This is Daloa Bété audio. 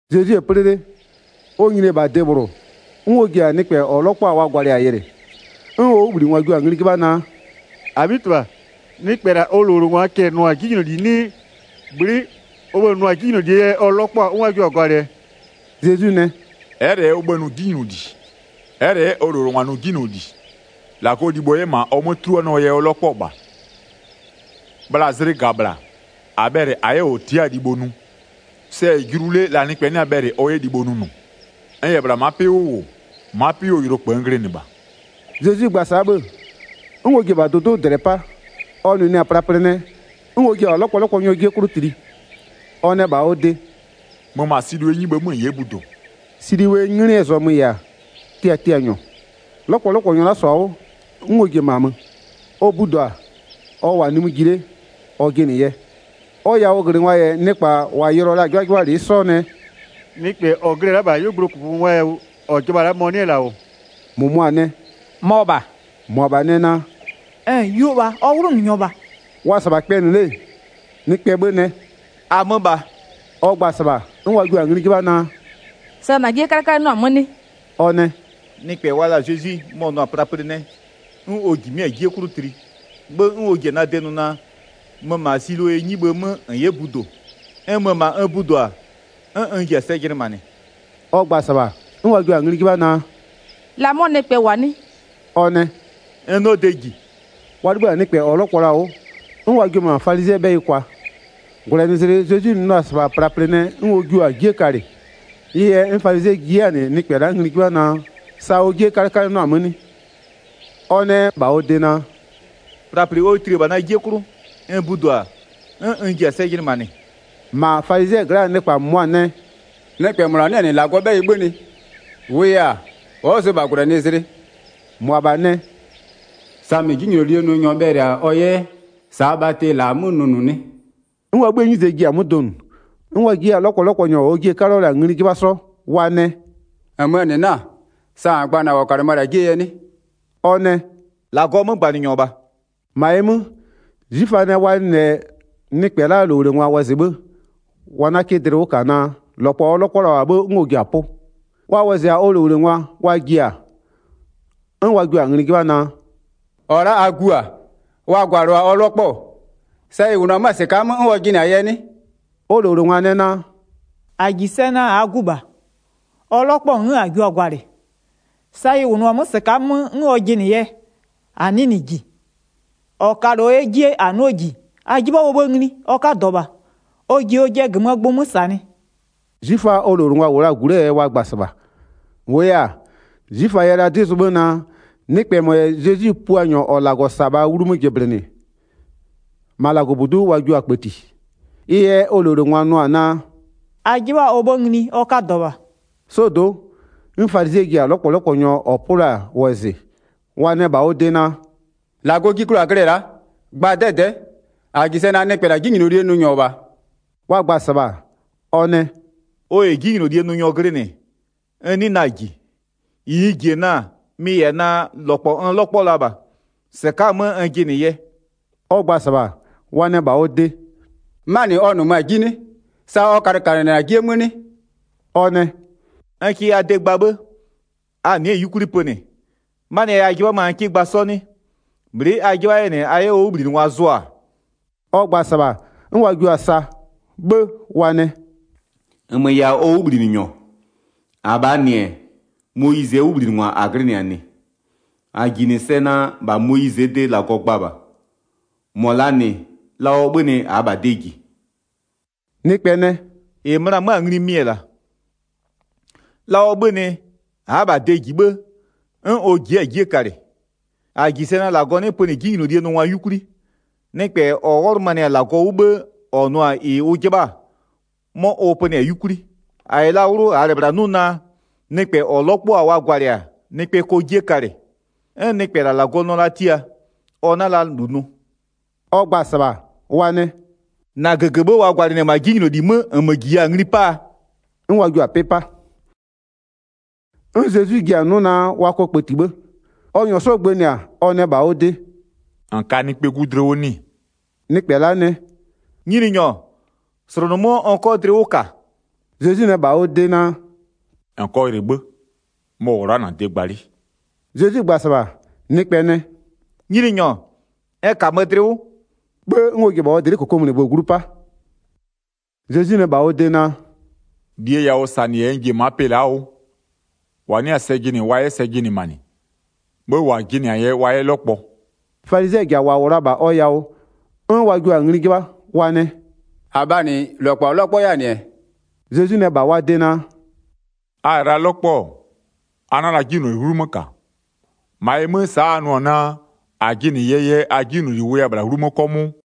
Zezwi-e 'plɩ 'le, ɔ nyini-e -bha de -bhlʋ, 'n ɔ ji-a nɩkpɛ -ɔ 'lɔkpɔ-a wa gwalɩ-a yɩlɩ. 'N ɔ 'wʋbhlinɩngwa jio-a ngli 'jɩbha naa: “-Abhitɩbha, nɩkpɛ -la ɔ -lowlengwaa cɛ-ɛ nʋ-a 'jinyloli 'nɩɩ, bhlɩ'ɩ ɔ bhë-ë nʋ-a 'jinylolie yɛ ɔ 'lɔkpɔ-a 'n wa jio-a gwalɩ-ɛ?” Zezwi nɛ: “Ɛ'ɛ -lɛ ɔ bhë-ë nʋ 'jinyloli, ɛ'ɛ -lɛ 'yɛ ɔ -lowlengwa nʋ 'jinyloli. -Lagɔɔ libho 'yɛ -ma ɔ 'mö 'tuluanɩɔɔ yɛ ɔ 'lɔkpɔ-ɔ -bha. Bhla zlɩ -ga -bhla, -a bhɛlɩ -a 'yɛ -ɔ tia'a-a libho nʋ, sɛ-ɛ julu 'le la nɩkpɛ 'nɩ-a bhɛlɩ ɔ 'yɛ libho nʋnʋ. N -yɛ -bhla ma'a 'pɩ 'wʋ -wʋ, ma'a 'pɩ 'wʋɔ yʋlokpë n glɩnɩ -bha.” Zezwi gba-a sa'a 'bhë, 'n ɔ ji-e -bha dʋdʋ'ʋ -dlɛ 'pa, ɔ nʋnʋɛ-a plaplɩ nɛ, 'n ɔ jiɩ-e -bha 'lɔkpɔlɔkpɔnyɔɔ 'jie 'klʋ tli. Ɔ nɛ -bha ɔ de: “Mö -ma Silowee 'nyibhë 'mö -n 'yɛ budo.” Silowee 'nglɩɛ zɔmö -yɛ-a “tiatianyɔ.” 'Lɔkpɔlɔkpɔnyɔ la'a -sɔ-a 'wʋ, 'n ɔ ji-e -ma mö, ɔ budo-a, ɔ -wʋ-a nimï ji 'le ɔ jɩnɩ yɛ. Ɔ yawʋglɩngwa -yɛ nɩkpa -wa yɩlɩɔ la-a 'jɩbhajɩbhalɩ'ɩ 'sɔ nɛ: “Nɩkpɛ -ɔ glɩ-ɛ la'a -bha 'yuogblʋɔ -kʋkʋyawʋ -ɔ jɩbha-a la'a, mɔ-ɔ 'nɩ-ɛ -la -wʋ?” 9-Mʋmʋa nɛ: “Mɔ -bha.” -Mʋabha nɛ naa: “Yuo -bha, ɔ 'wlʋnʋnyɔ -bha.” Wa-a -sɩbha kpɛnɩ 'le, nɩkpɛɛ 'bhë nɛ: “-Amö -bha.” Ɔ gba-a -sɩbha, 'n wa jio-a ngli 'jɩbha naa: “Sa -na 'jie 'kalɩkalɩnɩɔ-a 'mö 'nɩ?” Ɔ nɛ: “Nɩkpɛ wa la-a Zezwi, mɔ-ɔ nʋ-a plaplɩ nɛ, 'n ɔ -jimɩ'ɩ-a 'jie 'klʋ tli, 'bhë 'n ɔ ji-a na de nʋ naa: Mö -ma Silowee 'nyibhë 'mö -n 'yɛ budo. N mö-ö -ma n budo-a, 'n n ji-a sɛ jɩnɩmanɩ.” Ɔ gba-a -sɩbha, 'n wa jio-a ngli 'jɩbha naa: “La 'mɔ nɩkpɛ -wʋ-a 'nɩ?” Ɔ nɛ: “N 'nɩɔ de -ji.” Wa 'libhï-a nɩkpɛ -ɔ 'lɔkpɔ la-a 'wʋ, 'n wa jio-o -ma falizɩɛɛ 'bhɛyɩ kwa. 14-Gwlɛnɩzlɩ Zezwi nʋ la-a -sɩbha plaplɩ nɛ, 'n ɔ jio-a 'jie kalɩ. Ɩ yɛ 'n falizɩɛ ji 'yɛ-a -nɩ 'mɔ nɩkpɛ la'a ngli 'jɩbha naa, sa ɔ 'jie 'kalɩkalɩnɩɔ-a 'mö 'nɩ? Ɔ nɛ -bha wa de naa: “Plaplɩ ɔ tli-e -bha na 'jie 'klʋ, n budo-a, 'n n ji-a sɛ jɩnɩmanɩ.” 16-Ma falizɩɛ gla'aa nɩkpa -mʋmʋa nɛ: “Nɩkpɛ -mɔ -la 'nɩ-ɛ -nɩ -Lagɔɔ 'bhɛyɩ 'bhönɩ, -wʋʋ -yɛ-a, ɔ'ɔ zʋ -bha -gwlɛnɩzlɩ.” -Mʋabha nɛ: “Samɩ 'jinylolie nʋnyɔ bhɛlɩ-a ɔ 'yɛ -saa bhatɩ -la 'mö nʋnʋ 'nɩ?” 'N wa 'bhïë 'nyize ji-a 'mö donʋ. 'N wa ji 'yɛ-a 'lɔkpɔlɔkpɔnyɔ -ɔɔ jie-e 'kaluo la-a ngli 'jɩbha 'sɔ, wa nɛ: “-Nmöö -nɩ 'na-a, sa -n gba-a -na -ɔ -kalɩmö-ö -la 'jiee yɛ 'nɩ?” Ɔ nɛ: “-Lagɔɔ 'mögbanɩnyɔ -bha.” 18-Ma ɩ 'mö, 'zwiföa nɛ wa nɩ -lɛ nɩkpɛ la'aa -lowlengwa wɔzɩ 'bhë, wa 'na 'kɩ dlɩ 'wʋ -ka naa -lɔkpɔ-ɔ 'lɔkpɔ la -bha 'bhë 'n ɔ ji-a 'pʋ. Wa wɔzɩ-a ɔ -lowlengwa wa ji-a, 'n wa jua-a ngli 'jɩbha naa: “-Ɔ la'a a gu-a? Wa gwalɩɔ-a ɔ 'lɔkpɔ-ɔ? Sa ɩ -wʋnʋ-ɔ 'mö-a -sɩka'a 'mö 'n ɔ jɩnɩ-a yɛ 'nɩ?” Ɔ -lowlengwa nɛ naa: “-A -ji sɛ naa -aa gu -bha, ɔ 'lɔkpɔ-ɔ 'n -a jio-a gwalɩ. Sa ɩ -wʋnʋ-a 'mö -sɩka'a 'mö 'n ɔ jɩnɩ yɛ, -a 'nɩɩ -nɩ -ji, -ɔ kalɩɔ 'yɛ 'jie -a 'nɩɔ -ji, a 'jɩbha ɔ 'bhë ngli, ɔ 'kadɔ -bha, ɔ ji ɔjɩɛ -gömöö gbʋ 'mö -sanɩ.” 'Zwiföa ɔ -lowlengwa -wʋ la-a -gu 'lee yɛ wa gba-a -sɩbha. -Wʋʋ yɛ-a, 'zwiföa yɛ la 'dɩ zʋ 'bhë naa, nɩkpɛ -mɔ -yɛ Zezwi Puanyɔ -ɔ -Lagɔ -sa-a -bha 'wlumö jɩblɩnɩ-ɛ, -ma -Lagɔbudu'u wa jio-a kpëtie. Ɩ yɛ ɔ -lowlengwa nʋ-ɔ naa: “A 'jɩbha ɔ 'bhë ngli, ɔ 'kadɔ -bha.” 'Sɔdo'o, 'n falizɩɛ ji-a 'lɔkpɔlɔkpɔnyɔ -ɔ 'pʋ la-a wɔzɩ, wa nɛ -bha ɔ de naa: “-Lagɔ ji klʋ -a glɩ-ɛ la'a, gba 'dɛdɛ'ɛ, -a -ji sɛ naa nɩkpɛ -la 'jinylolie nʋnyɔ -bha.” Wa gba-a -sɩbha, ɔ nɛ: “Ɔ -yɛ 'jinylolie nʋnyɔ glɩnɩ, n 'nɩɩ na-a -ji. -Ɩ n -ji-e na-a, mɩ-ɩ -yɛ-a naa: -Lɔkpɔ n 'lɔkpɔ-ɔ la -bha, -sɩka'a-a 'mö n jɩnɩ yɛ.” Ɔ gba-a -sɩbha, wa nɛ -bha ɔ de: “'Manɩ ɔ -nʋmö-a 'ji 'nɩ? Sa ɔ kalɩkalɩnɩ-ɛ -na 'jie 'mö 'nɩ?” Ɔ nɛ: “N kɩ a de gba 'bhë, a nɩ'ɩ-ɛ 'yukwli pönɩ. 'Manɩɛ yɛ a 'jɩbha 'mö-a n 'kɩ gba 'sɔ 'nɩ? Bhlɩ'ɩ a 'jɩbha 'yɛ -nɩ a 'yɛ ɔ 'wʋbhlinɩngwa zʋ-a?” Ɔ gba-a -sɩbha, 'n wa jio-a sa. 'Bhë wa nɛ: “-Nmö -yɛ-a ɔ 'wʋbhlinɩnyɔ, -abhaa -nɩ-ɛ, Moyizɩɛ 'wʋbhlinɩngwa -a glɩnɩ-a -nɩ. 29-A -ji -nɩ sɛ naa, -bha Moyizɩɛ de -Lagɔ gba -bha, -mɔ -laa -nɩ, la ɔ 'bhönɩ -aa -bha de -ji.” Nɩkpɛ nɛ: “-Ɩ möna 'mö-a ngli mɩ-ɛ -la: La ɔ 'bhönɩ, a'a -bha de -ji 'bhë, 'n ɔ ji'i-a 'jie kalɩ. 31-A -ji sɛ naa -Lagɔ 'nɩ pönɩ 'jinylolie nʋngwa 'yukwli, nɩkpɛ -ɔ wɔlʋmanɩ-a -Lagɔ 'wʋ 'bhë -ɔ nʋ-a -ɩ ʋ 'jɩbha-a, 'mɔ ʋ pönɩ-a 'yukwli. 32-A -yɛ la 'wlʋ -aa -lɛ -bhla 'nʋ naa, nɩkpɛ -ɔ 'lɔkpɔ-a wa gwalɩ-a, nɩkpɛ kɔ 'jie kalɩ. 'N nɩkpɛ -la -Lagɔ nɩɔ la tia, ɔ 'na la -lu nʋ.” Ɔ gba-a -sɩbha, wa nɛ: “-Na -gëgëbhë wa gwalɩnɩ-ɛ -ma 'jinyloli 'mö, -nmö -jiya-a ngli 'paa?” 'N wa jio-a 'pɩ 'pa. 'N Zezwi ji-a 'nʋ naa wa kɔ kpëti 'bhë. Ɔ -nyɔɔ 'sɔ gbënɩ-a, ɔ nɛ -bha ɔ de: “-N ka Nɩkpɛɛ 'Gu dlɩ 'wʋ 'nɩ-ɩ?” Nɩkpɛ la'a nɛ: “Nyininyɔ, -slʋnʋmö'öɔ n 'kɔ dlɩ 'wʋ -ka.” Zezwi nɛ -bha ɔ de naa: “-N kɔ yɩlɩ 'bhë, mɔ -wʋ-ɔ la'a -na de gba 'le.” Zezwi gba-a -sɩbha, nɩkpɛ nɛ: “Nyininyɔ, n -kamö dlɩ 'wʋ.” 'Bhë 'n ɔ ji-e -bha ɔ dlɩ'ɩ -kokomunigbö glu 'pa. Zezwi nɛ -bha ɔ de naa: “-Lie yawʋsanɩ -yɛ n ji-e ma'a pɩ la'aa 'wʋ. -Wa 'nɩ-a sɛ jɩnɩ wa 'yɛ sɛ jɩnɩmanɩ, 'bhë -wa jɩnɩ-a yɛ wa 'yɛ 'lɔkpɔ.” Falizɩɛ -ja -wa -wʋ la-a -bha ɔ yawʋ, 'n wa jio-a ngli 'jɩbha, wa nɛ: “-Abhaa -nɩ, -lɔkpɔ -a 'lɔkpɔ 'yɛ-a -nɩ-ɛ?” Zezwi nɛ -bha wa de naa: “A -yɛ la 'lɔkpɔ-ɔ, a 'na la 'jinyloli 'wlumö -ka, -ma ɩ 'mö, sa'a a nʋ-ɔ naa: -A jɩnɩ yɛɛ yɛ a 'jinyloli wʋya -bhla 'wlumö 'kɔmʋʋ.”